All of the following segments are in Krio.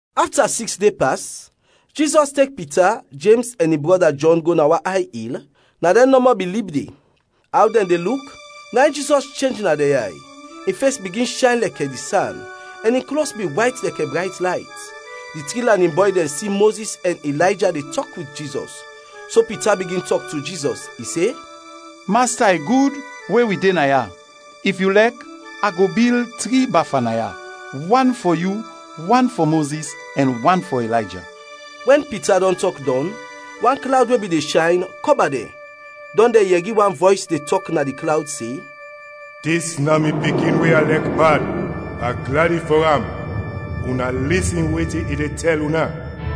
Afta siks de pas, Jizɔs tek Pita, Jems ɛn in brɔda Jɔn go na wan ay il, na dɛn nɔmɔ bin lib de. Aw dɛn de luk, na in Jizɔs chenj na dɛn yay, in fes bigin shayn lɛkɛ di san, ɛn in klos bin wayt lɛkɛ brayt layt. Di tri lanin bɔy dɛn si Mozis ɛn Ilayja de tɔk wit Jizɔs. So Pita bigin tɔk to Jizɔs, i se, “Masta, i gud we wi de naya! If yu lɛk, a go bil tri bafa naya, wan fɔ yu, wan fɔ Mozis ɛn wan fɔ Ilayja.” Wɛn Pita dɔn tɔk dɔn, wan klawd we bin de shayn, kɔba dɛn, dɔn dɛn yɛri wan vɔys de tɔk na di klawd se, “Dis na mi Pikin we a lɛk bad, a gladi fɔ am, una lisin wetin i de tɛl una.”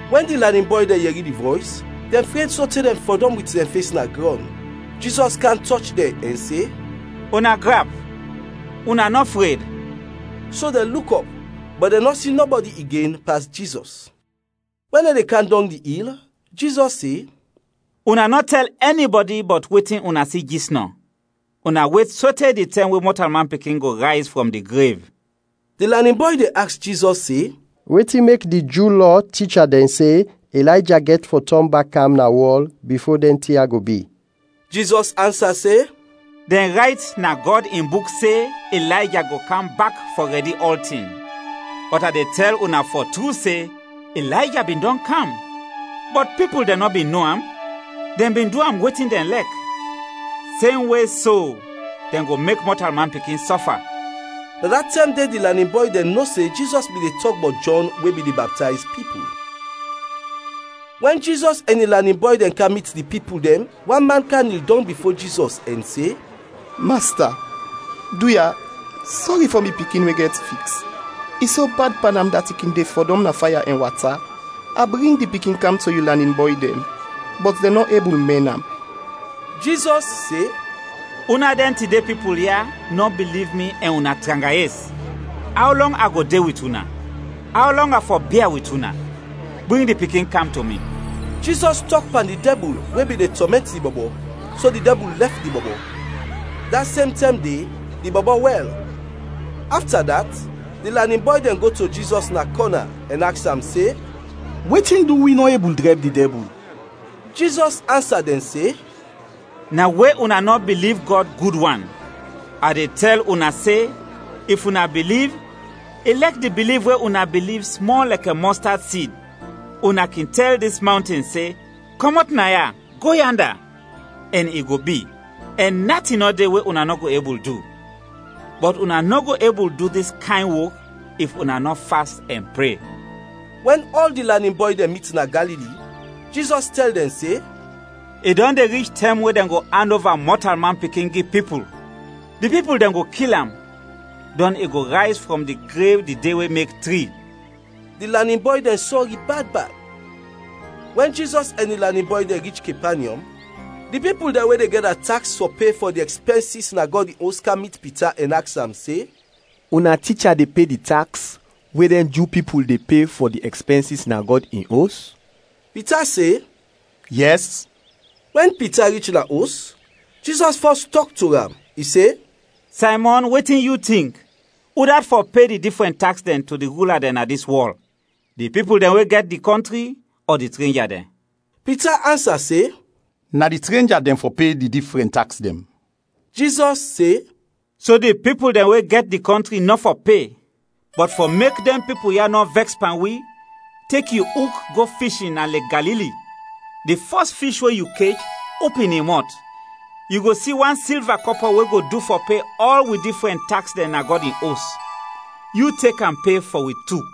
Wɛn di lanin bɔy dɛn yɛri di vɔys, dɛn fred sote dɛn fɔdɔm wit dɛn fes na grɔn. Jizɔs kam tɔch dɛn, ɛn se, “Una grap, una nɔ fred!” So dɛn luk ɔp, bɔt dɛn nɔ si nɔbɔdi igen, pas Jizɔs. Wɛn dɛn de kam dɔng di il, Jizɔs se, “Una nɔ tɛl ɛnibɔdi bɔt wetin una si jisnɔ, una wet sote di tɛm we Mɔtalman Pikin go rayz frɔm di grev.” Di lanin bɔy dɛn aks Jizɔs se, “Wetin mek di Ju Lɔ ticha dɛn se Ilayja gɛt fɔ tɔn bak kam na wɔl bifo dɛn tin ya go bi?” Jizɔs ansa se, “Dɛn rayt na Gɔd in Buk se Ilayja go kam bak fɔ rɛdi ɔltin. Bɔt a de tɛl una fɔ tru se, Ilayja bin dɔn kam, bɔt pipul dɛn nɔ bin no am, dɛn bin du am wetin dɛn lɛk. Semwe so dɛn go mek Mɔtalman Pikin sɔfa.” Na da tɛm de di lanin bɔy dɛn no se Jizɔs bin de tɔk bɔt Jɔn we bin de baptayz pipul. Wɛn Jizɔs ɛn in lanin bɔy dɛn kam mit di pipul dɛn wan man kam nil dɔng bifo Jizɔs ɛn se, “Masta, duya, sɔri fɔ mi pikin we gɛt fiks, i so bad pan am dat i kin de fɔdɔm na faya ɛn wata. A bring di pikin kam to yu lanin bɔy dɛn, bɔt dɛn nɔ ebul mɛn am.” Jizɔs se, “Una dɛn tide pipul ya nɔ biliv mi ɛn una tranga yes. Aw lɔng a go de wit una? Aw lɔng a fɔ bia wit una? Bring di pikin kam to mi.” Jizɔs tɔk pan di dɛbul we bin de tɔmɛnt di bɔbɔ, so di dɛbul lɛf di bɔbɔ. Da sem tɛm de di bɔbɔ wɛl. Afta dat, di lanin bɔy dɛn go to Jizɔs na kɔna ɛn aks am se, “Wetin du wi nɔ ebul drɛb di dɛbul?” Jizɔs ansa dɛn se, “Na we una nɔ biliv Gɔd gud wan. A de tɛl una se, if una biliv, ilɛk di biliv we una biliv smɔl lɛkɛ mɔstad sid, una kin tɛl dis mawnten se, ‘Kɔmɔt naya, go yanda!’ ɛn i go bi. Ɛn natin nɔ de we una nɔ go ebul du! [ Bɔt una nɔ go ebul du dis kayn wok if una nɔ fast ɛn pre.]” Wɛn ɔl di lanin bɔy dɛn mit na Galili, Jizɔs tɛl dɛn se, “I dɔn de rich tɛm we dɛn go and ova Mɔtalman Pikin gi pipul. Di pipul dɛn go kil am, dɔn i go rayz frɔm di grev di de we mek tri.” Di lanin bɔy dɛn sɔri bad bad. Wɛn Jizɔs ɛn in lanin bɔy dɛn rich Kepanyɔm, di pipul dɛn we de gɛda taks fɔ pe fɔ di ɛkspɛnsis na Gɔd in Os kam mit Pita ɛn aks am se, “Una ticha de pe di taks we dɛn Ju pipul de pe fɔ di ɛkspɛnsis na Gɔd in Os?” Pita se, “Yɛs!” Wɛn Pita rich na os, Jizɔs fɔs tɔk to am, i se, “Saymɔn, wetin yu tink, udat fɔ pe di difrɛn taks dɛn to di rula dɛn na dis wɔl, di pipul dɛn we gɛt di kɔntri ɔ di trenja dɛn?” Pita ansa se, “Na di trenja dɛn fɔ pe di difrɛn taks dɛn.” Jizɔs se, “So di pipul dɛn we gɛt di kɔntri nɔ fɔ pe. Bɔt fɔ mek dɛn pipul ya nɔ vɛks pan wi, tek yu uk go fishin na Lek Galili. Di fɔs fish we yu kech, opin in mɔt, yu go si wan silva kɔpɔ we go du fɔ pe ɔl wi difrɛn taks dɛn na Gɔd in Os. Yu tek am pe fɔ wi tu.”